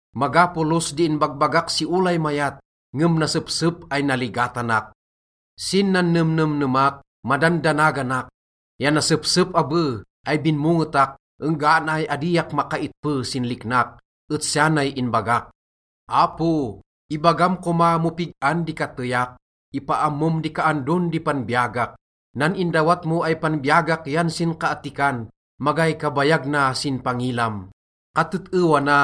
Maga polos di inbagbagak si olay mayat, ngem nasepsep ay naligatanak. Sin nannemnemnemak, madandanaganak, ya nasepsep abe ay binmongetak enggana ay adiak makaitpe sin liknak, et siya nay inbagak, “Apo, ibagam koma mo pig-an di kateyak, ipaammom di kaandon di panbiyagak. Nan indawat mo ay panbiyagak yan sinkaattikan, magay kabayag na sin pangilam. Katet-ewa na,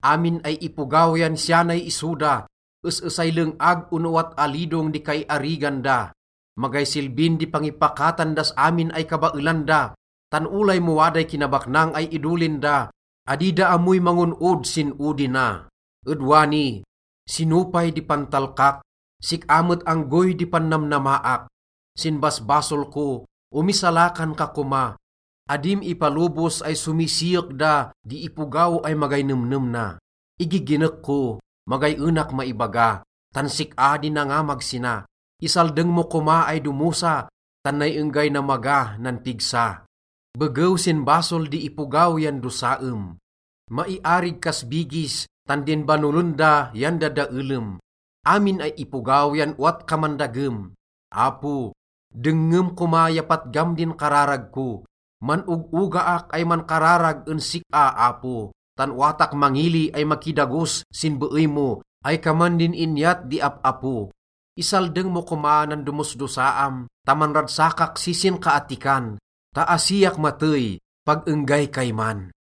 amin ay ipogaw yan siya nay iso da, es-esay leng-ag ono owat alidong di kaiarigan da. Magay silbin di pangipakatan das amin ay kabaelan da, tan olay mo waday kinabaknang ay idolin da, adi da ammoy mangon-od sin odi na. Ed wani, sino pay di pantalkak? Sik-a met anggoy di pannamnamaak. Sin basbasol ko, omisalakan ka koma. Adim ipalobos ay somisiyek da di ipogaw ay magay nemnem na. Igiginek ko, magay enak maibaga, tan sik-a di nangamag sina. Isaldeng mo koma ay domosa, tan nay enggay namaga nan pigsa. Begew sin basol di ipogaw yan dosaem, maiarig kas bigis, tan din banolen da yan dadaelem. Amin ay ipogaw yan owat kaman dagem. Apo, dengngem koma ya patgam din kararag ko. Man-og-ogaak ay mankararag en sik-a, Apo, tan owatak mangili ay makidagos sin beey mo ay kaman din inyat di ap-apo. Isaldeng mo koma nan domosdosaam ta manragsakak si sinkaattikan ta asiak matey pag enggay kayman.”